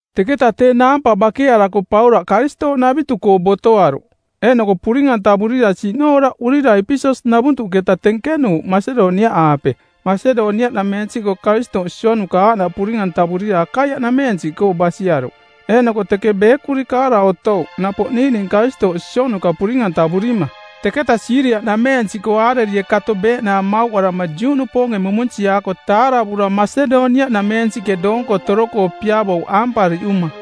Teketa tee naampa bakearako Paulaꞌ Karistooꞌnavitu-koo botoaruꞌ, eeꞌnoko puring-antavurira siꞌnooraꞌurira Epeses-navuntuꞌketa tenkenuuꞌ Masedoniaꞌaape. Masedoniaꞌnameensiꞌkoo Karistooꞌ sionuka aaꞌnaꞌ puring-antavurira Akaiaꞌnameensiꞌkoo basiaruꞌ. Eeꞌnoko teke beekuri kaara otouꞌ napoꞌ niiꞌning Karistooꞌ sionuka puring-antavurima. Teketa Siiria-nameensiꞌkoo aarerie kato beeꞌnaang mauꞌarama Juꞌnupoonge mumunsiaako taaravura Masedoniaꞌnameensiꞌke doonko toro-koo piavouꞌ aampariꞌuma.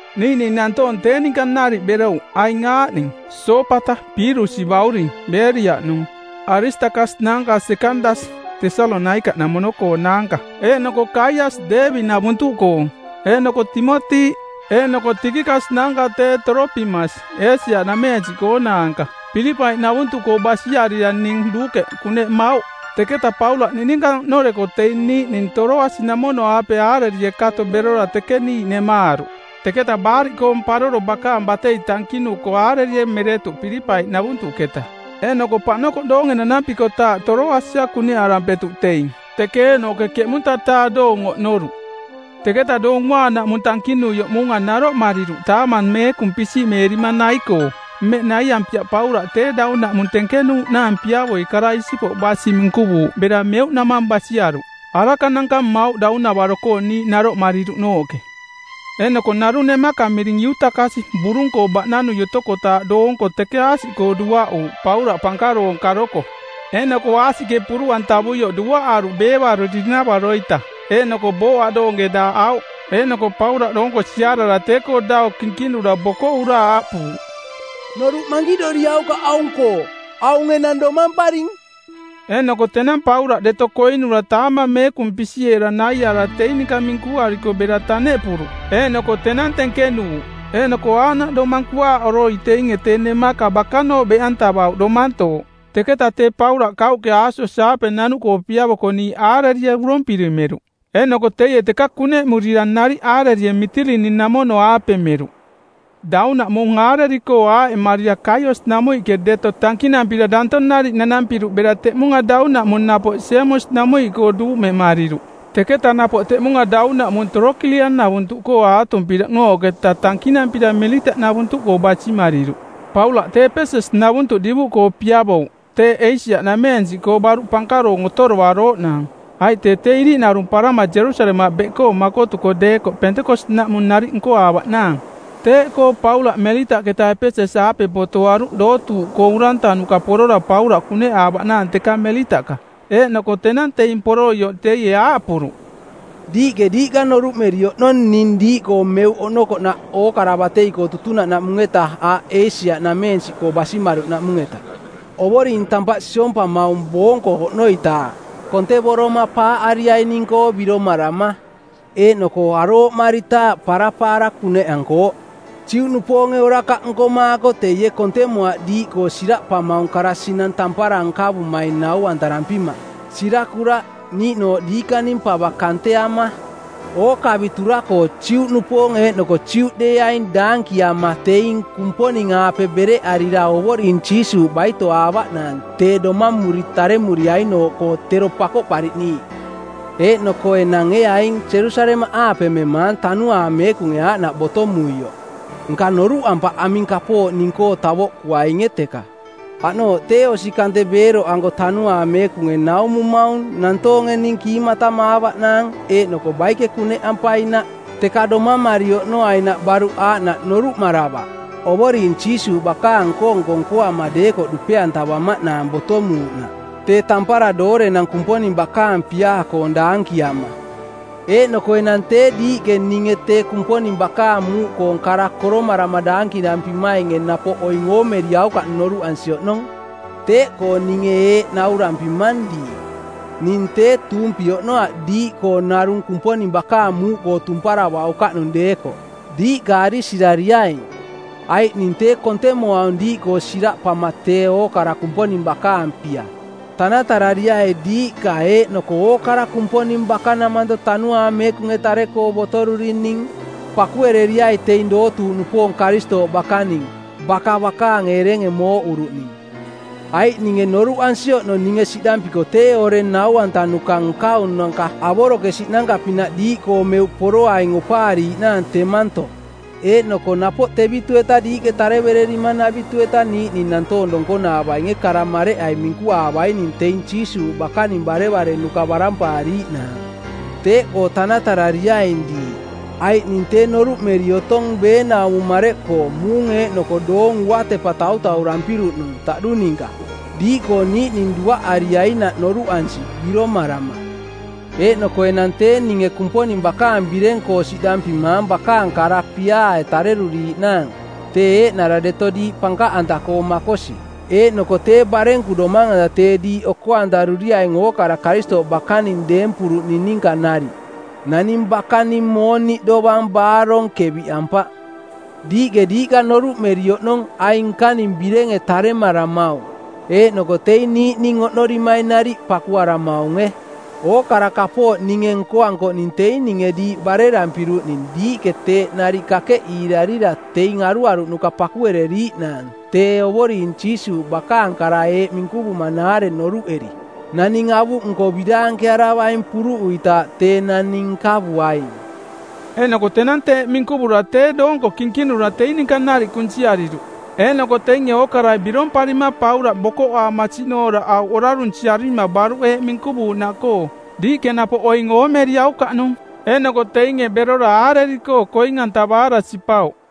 Niiꞌning nantoong tee ninka nariꞌ berouꞌ aing aaꞌning: Soopata Piirusi bauring, Beeriaꞌnung; Aristakas naanka Sekandas, Tesalonaikaꞌnamono-koonaanka; eeꞌnoko Kaiasi, Deebi-navuntuꞌkoong; eeꞌnoko Timoti; eeꞌnoko Tikikas naanka tee Toropimas, Eesia-nameensiꞌkoonaanka. Pilipai-navuntuꞌkoo basiarira ning Luukeꞌ kuneꞌmauꞌ. Teketa Paulaꞌ niꞌninka oꞌnoreko teing niiꞌning Toroasi-namono-aape aarerie kato berora teke niiꞌ nemaaruꞌ. Teketa Baariꞌkoong˜ Paroro bakaang batei tankinuko aarerie meretuꞌ Pilipai-navuntuꞌketa, eeꞌnoko paꞌnokoꞌ doonge nanampikotaaꞌ Toroasia kuneꞌarampetuꞌ teing, teke eeꞌnooꞌke ˜keꞌmunta-taa doong oꞌnoruꞌ. Teketa Doong Uaanaꞌmung tankinuioꞌ muunga naroꞌmariruꞌ taamang meekung pisiꞌmeerima nai-koo. Mmeꞌ naiampiaꞌ Paulaꞌ tee daunaꞌmung tenkenuuꞌnaang piavoi kara isipoꞌ basi minkuvuuꞌ bera meuꞌnamang basiaruꞌ. Arakananka mmauꞌ daunavaro-koo niiꞌ naroꞌmariruꞌnooꞌke. Eeꞌnoko narung nemaka miring Iutakasi burung-koo baꞌnanui otokotaaꞌ doonko teke aasiꞌkoo duaꞌuuꞌ Paulaꞌ pankaroong karoko. Eeꞌnoko aasiꞌke puruꞌantavuioꞌ duaꞌaruꞌ beevarori-navaro-ita eeꞌnoko booꞌ aꞌdoonge daaꞌauꞌ. Eeꞌnoko Paulaꞌ doonko siarara tee-koo dau kinkinura bokoꞌura aaꞌpuuꞌ, “Noruꞌ mankiꞌdoriaukaꞌ aung-koo, aung enang domamparing.” Eeꞌnoko tenang Paulaꞌ deto koinura taamang meekung pisiꞌeera naiaara teing ninka minkuariko bera taneꞌpuruꞌ, eeꞌnoko tenang tenkenuuꞌ. Eeꞌnoko aaꞌnaꞌ domang kuaaꞌoroi teinge tee nemaka bakanooꞌ beꞌantavauꞌ domantooꞌ. Teketa tee Paulaꞌ kauꞌke Aasos-aape nanuꞌkoo piavoko niiꞌ aarerie urompiri meruꞌ. Eeꞌnoko teie teka kuneꞌmurira nariꞌ aarerie Mitilini-namono-aape meruꞌ. Daunaꞌmung aareri-koo aaꞌemarira Kaios-namuiꞌke deto tankinampira danto nariꞌ nanampiruꞌ bera teꞌmunga daunaꞌmung napoꞌ Semos-namuiꞌkoo duumemariruꞌ˜. Teketa napoꞌ teꞌmunga daunaꞌmung Torokilian-navuntuꞌkoo aatumpiruꞌnooꞌketa tankinampira Melitaꞌnavuntuꞌkoo basimariruꞌ. Paulaꞌ tee Epeses-navuntuꞌ divuꞌkoo piavouꞌ teeꞌ Eesia-nameensiꞌkoo baruꞌ pankaroong otoarooꞌnaang, aiꞌ tee tee iriꞌnarumparama Jerusalemaꞌ beꞌkoo makotuko deekoꞌ Pentekos-naꞌmung nariꞌ nkoaavaꞌnaang. Teeꞌkoo Paulaꞌ Melitaꞌketa Epeses-aape botoaruꞌ dootuuꞌkoo urantanuka porora Paulaꞌ kuneꞌaavaꞌnaang teka Melitaꞌka. Eeꞌnoko tenang teing poroioꞌ teie aaꞌpuruꞌ, “Diiꞌke diiꞌka noruꞌmeri oꞌnong ning diiꞌkoo meuꞌke oꞌnokoꞌnaꞌ ookara batei-koo tutunaꞌnaꞌmung-eta aaꞌ Eesia-nameensiꞌ basimaruꞌnaꞌmung-eta. Ovoring tampaꞌ siompamaung boonko oꞌnoitaaꞌ, kontevoroma paaꞌariaining-koo biromarama, eeꞌnoko arooꞌmaritaaꞌ parapaara kuneꞌankooꞌ. Juꞌnupoonge orakaꞌ nkomaako teie kontemoaꞌ diiꞌkoo siraꞌpamaung kara sinang tampara nkavumaing nau-antarampima, sirakuraꞌ, niiꞌnooꞌ diikaning pava kanteama. Ookavitura-koo Juꞌnupoong eeꞌnoko Juꞌdeeaing daankiama teing Kumponing-aape bereꞌarira Ovoring Jiisuuꞌ baitoaavaꞌnaang tee domamuri taremuriainooꞌkoo tero Pakoꞌpariꞌniiꞌ. Eeꞌnoko enang ee aing Jerusalemaꞌaape memaang Tanuaang Meekunge aaꞌnaꞌ botomuioꞌ, nka noruꞌampaꞌ aming kapooꞌ ning-koo tavoꞌkuainge teka. Aꞌnooꞌ tee osi kante beeroꞌanko Tanuaang Meekunge naumumaung nantoonge ning kiimatamaavaꞌnaang eeꞌnoko baike kuneꞌampainaꞌ. Teka domamari oꞌnoainaꞌ baruꞌ aaꞌnaꞌ noruꞌmaravaꞌ, Ovoring Jiisuuꞌ bakaang nko-nko nkoama deekoꞌ dupe-antavamaꞌnaang botomuuꞌnaꞌ tee tampara doorenang Kumponing bakaang piaa-koong daankiama. “Eeꞌnoko enang tee diiꞌke ninge tee Kumponing bakaang muuꞌkoong kara koromarama daankirampimainge napoꞌ oing oomeriaukaꞌnung noruꞌansi oꞌnong. Teeꞌkoo ninge eeꞌ naurampimang diiꞌ, ning tee tuumpi oꞌnoaꞌ diiꞌkoo narung Kumponing bakaang muuꞌkoo tumparavaukaꞌnung deekoꞌ. Diiꞌka arisirariaing. Aiꞌ ning tee kontemoaung diiꞌkoo siraꞌpama tee ookara Kumponing bakaang pia. Tanatarariai diiꞌka eeꞌnoko ookara Kumponing bakanamanto Tanuaang Meekunge tare-koo botorurining. Pakuereriai teing dootuuꞌnupoong Karistooꞌ bakaning, baka bakaang erenge mooꞌuruꞌning. Aiꞌ ninge noruꞌansi oꞌnong ninge siꞌdampiko tee oreng nau-antanuka nkaunanka avorokesiꞌnanka-pinaꞌ diiꞌkoo meuꞌ poroaing opaariiꞌnaang temanto. Eeꞌnoko napoꞌ tevitu-eta diiꞌke tarevererimanavitu-eta niiꞌning nantoong donkonaavainge kara mareꞌai minkuaavaining teing Jiisuuꞌ bakaning barevarenuka barampaariiꞌnaang. Teeꞌkoo tanatarariaing diiꞌ, aiꞌ ning tee noruꞌmeri otong beenaumo mareꞌkoo muung eeꞌnoko doong uatepa tautaurampiruꞌnung taꞌdu ninka, diiꞌkoo niiꞌning duaꞌariainaꞌ noruꞌansi biromarama. “Eeꞌnoko enang tee ninge Kumponing bakaang bireng-koo siꞌdampimaang bakaang kara piaae tareruriiꞌnaang, tee eeꞌnara deto diiꞌ pankaꞌanta-koo makosi, eeꞌnoko tee barenku domang-anta tee diiꞌ oko-antaruriaing ookara Karistooꞌ bakaning deempuruꞌning ninka nariꞌ. Naning bakaning mooniꞌ dovang baarong keviꞌampaꞌ. Diiꞌke diiꞌka noruꞌmeri oꞌnong aing nkaning birenge taremaramaung, eeꞌnoko teing niiꞌning oꞌnorimaing nariꞌ pakuaramaunge. Ookara kapooꞌ ninge nkoankoꞌning teing ninge diiꞌ barerampiruꞌning diiꞌke teeꞌ nariꞌ kakeꞌiirarira teing aruaruꞌnuka pakuereriiꞌnaang tee Ovoring Jiisuuꞌ bakaang kara eeꞌ minkuvuuꞌnaare noruꞌeri, ‘Naning avuꞌnko biraankearavaing puruꞌuitaaꞌ tee naning nkavuaing.’” Eeꞌnoko tenang teeꞌ minkuvura tee doonko kinkinura teing ninka nariꞌ kunsiariruꞌ. Eeꞌnoko teinge ookarai biromparima Paulaꞌ bokoꞌaama siꞌnooraꞌauꞌ orarunsiarima baruꞌ eeꞌ minkuvuuꞌnaꞌkoo, “Diiꞌke napoꞌ oing oomeriaukaꞌnung.” Eeꞌnoko teinge berora aareri-koo koing-antavaara sipauꞌ.